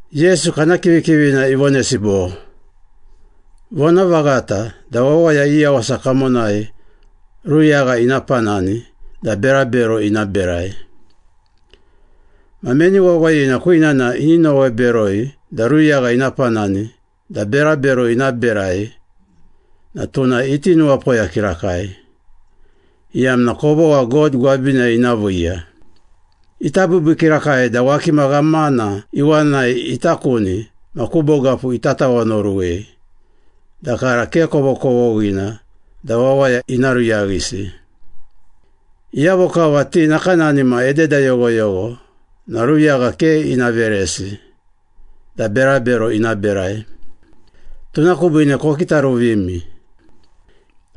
Yesu kana kivikivina ivonesi bo, “Vonavaghata da wawaya i yawasa kamonai ruyagha ina panani da berabero ina berai. Ma meni wawayina kwinana ini nowe beroi da ruyagha ina panani da berabero ina berai na tuna iti nuwapoya kirakai, iyamna kovogha God gwabinai ina viiya. Ita biibii kirakai da wakima ghamana iwanai ita kuni ma ku bogapu ita tawanoruwei da kara ke kovokovoghina da wawaya ina ruyaghisi, iyavo kava ti nakanani ma ededa yoghoyogho na ruyagha ke ina veresi da berabero ina berai. Tuna kubiine kokitaruvimi.”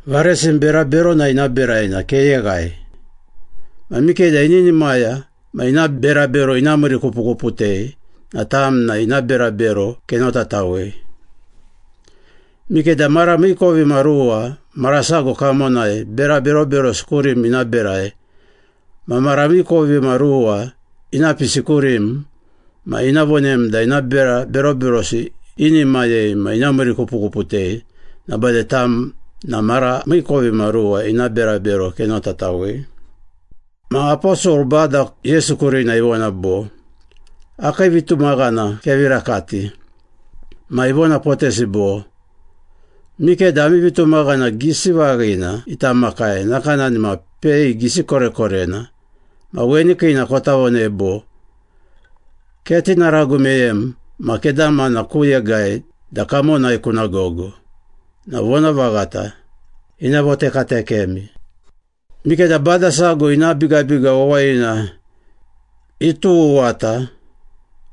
“Varesim bera berona ina berai na keyeghai. Ma mikeda ininimaya ma ina berabero ina miirikupukuputei na tam na ina berabero kenotatawei. Mikeda mara miikovimaruwa mara sago kamonai bera beroberosi kurim ina berai ma mara miikovimaruwa ina pisi kurim ma ina vonem da ina bera beroberosi inimayei ma ina miirikupukuputei na bade tam na mara miikovimaruwa ina berabero kenotatawei.” Ma aposol Bada Yesu kurina ivona bo, “Akii vitumaghana kevi rakati.” Ma ivonapotesi bo, “Mikeda ami vitumaghana gisi vaghina ita makai nakanani ma pei gisi korekorena ma weni kiina kota vonei bo, ‘Ketinaragu meyem ma kedamana ku yegai da kamonai kuna gogo,’ na vonavaghata, ina votekatekemi.” “Mikeda bada sago ina bigabiga wawayina ituwuwata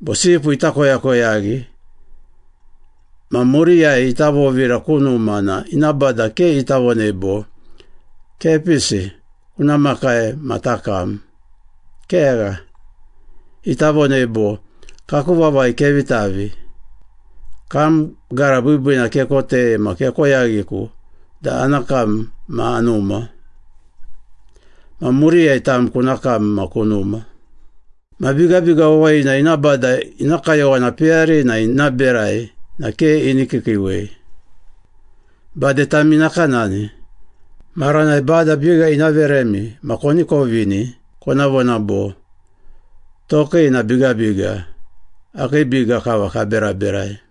bo sipu ita koyakoyaghi ma muriyai ita vovira ku numa na ina bada ke ita vonei bo, ‘Kepisi, kuna makai ma takam.’ Kegha, ita vonei bo, ‘Kaku vavai kevi tavi, kam gara biibiina kekotei ma kekoyaghiku da ana kam ma anuma. Ma muriyai tam kuna kam ma kunuma.’ Ma bigabiga wawayina ina bada ina kayowana peyarina ina berai na ke ini kiikiiwei. Bade tami nakanani, maranai Bada biga ina veremi ma koni kovini, kona vona bo, ‘Tokii na bigabiga, akii biga kava kaberaberai.’”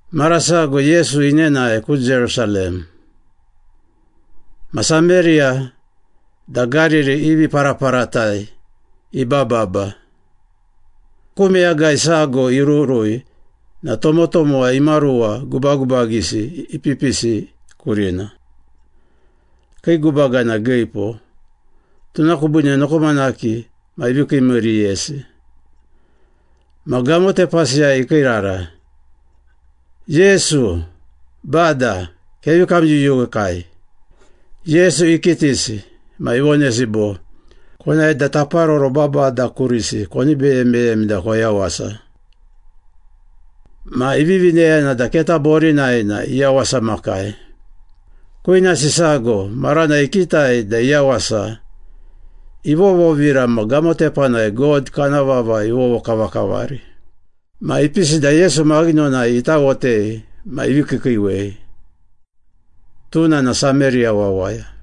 Mara sago Yesu inenae ku Jerusalem. Ma Sameriya da Gariri i viparaparatai ibababa. Ku meyagai sago irurui na tomotomowa imaruwa gubagubagisi ipipisi kurina. Kii gubaga na giipo, tuna kubiine nokomanaki ma ivi kiimiiriyesi. Ma gamotepasiyai ikiirara. “Yesu! Bada! Kevi kamyuyuwekai!” Yesu ikitisi, ma ivonesi bo, “Konae da taparoro babada kurisi koni beye meyemi da koyawasa.” Ma ivivi neyana da keta borinai na iyawasamakai. Kwinasi sago, maranai ikitai da iyawasa, ivovovira ma gamotepanai God kana vava ivovokavakavari. Ma ipisi da Yesu maghinonai itawotei ma ivi kiikiiwei. Tuna na Sameriya wawaya.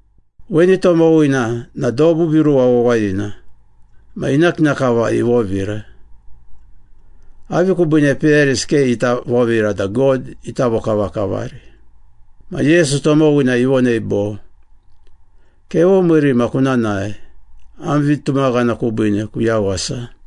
Weni tomowina na dobu viruwa wawayina, ma ina kina kava ivovira. Avi kubiine peyarisi ke ita vovira da God ita vokavakavari?” Ma Yesu tomowina ivonei bo, “Kevomiiri ma kuna nae, am vitumaghana kubiine kuyawasa.”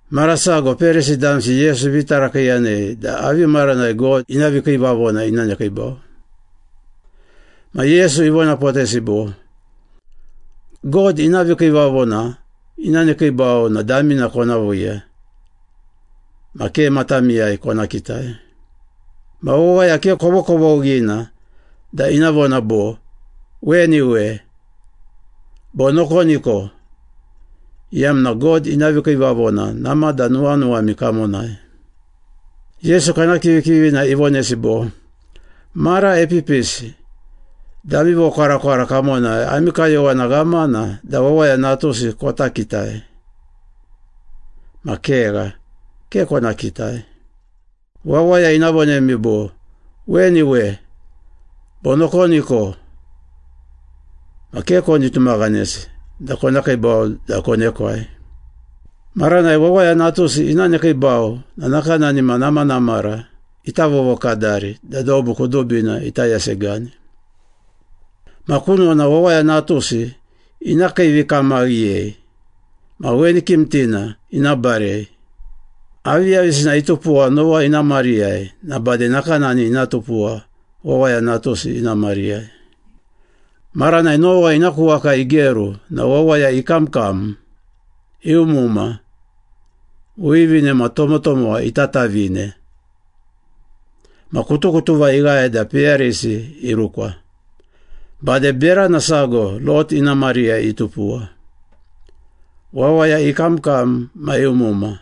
Mara sago Perisi damsi Yesu ivi tarakiiyanei da avi maranai God ina vikiivavona ina nekiibau. Ma Yesu ivonapotesi bo, “God ina vikiivavona ina nekiibau na damina kona viiya, ma ke matamiyai kona kitai. Ma wawaya ke kovokovoghina da ina vona bo, ‘Weni we,’ bo ‘Nokoniko!’ iyamna God ina vikiivavona namada nuwanuwami kamonai.” Yesu kana kivikivina ivonesi bo, “Mara epipisi da ami vokwarakwara kamonai ami kayowana ghamana da Wawaya Natusi kota kitai. Ma kegha, ke kona kitai. Wawaya ina vonemi bo, ‘Weni we,’ bo ‘Nokoniko!’ Ma ke koni tumaghanesi da kona kiibau da konekwai. Maranai Wawaya Natusi ina nekiibau na nakanani ma namanamara ita vovokadari da dobu kudubina ita yasegani. Ma kunona Wawaya Natusi ina kiivikamaghiyei ma weni kimtina ina barei. Aviyavisina itupuwa Nowa ina mariyai, na bade nakanani ina tupuwa Wawaya Natusi ina mariyai. Maranai Nowa ina ku waka igeru na wawaya ikamkam, iumuma, wivine ma tomotomowa itatavine. Ma kutukutuva ighae da peyarisi irukwa. Bade berana sago Lot ina mariyai itupuwa. Wawaya ikamkam ma iumuma,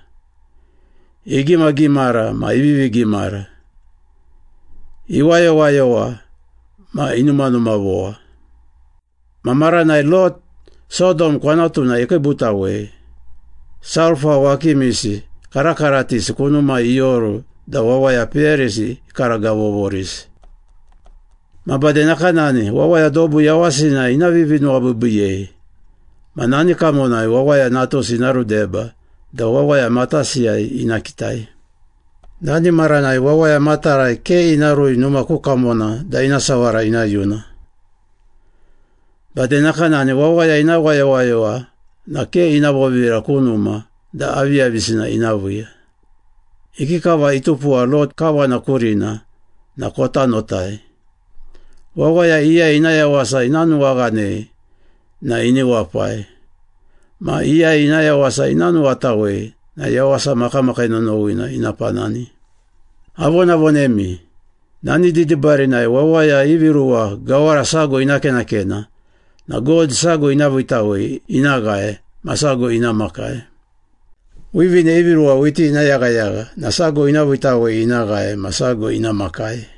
igimagimara ma ivivi gimara, iwayowayowa ma inumanumavowa. Ma maranai Lot, Sodom kwanatuna ikiibutawei, sulpa wakimisi karakaratisi kunumai ioru da wawaya peyarisi ikaragavogavovorisi. Ma bade nakanani, wawaya dobu yawasina ina vivinuwabiibiiyei ma nani kamonai Wawaya Natusi ina rudeba da wawaya matasiyai ina kitai.” “Nani maranai wawaya matarai ke ina rui numa ku kamona da ina sawara ina yuna. Bade nakanani wawaya ina wayowayowa na ke ina vovira ku numa da aviyavisina ina viiya. Ikikava itupuwa Lot kawana kurina na kota notai. Wawaya iyai ina yawasa ina nuwaghanei na ini wapai, ma iyai ina yawasa ina nuwatawei na yawasa makamakii nonowina ina panani. Avonavonemi, nani didibarinai wawaya ivi ruwa gawara sago ina kenakena na God sago ina viitawei ina ghae ma sago ina makai. Wivine ivi ruwa whiti ina yaghayagha na sago ina viitawei ina ghae ma sago ina makai.”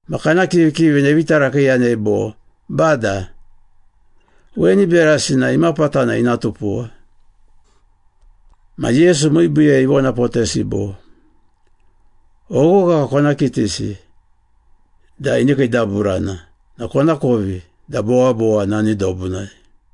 Ma kana kivikivina ivi tarakiiyanei bo, “Bada, weni berasi na imapatana ina tupuwa?” Ma Yesu miibiiyai ivonapotesi bo, “Oghogha kona kitisi da ini kiidaburana na konakovi da bowabowa nani dobunai.”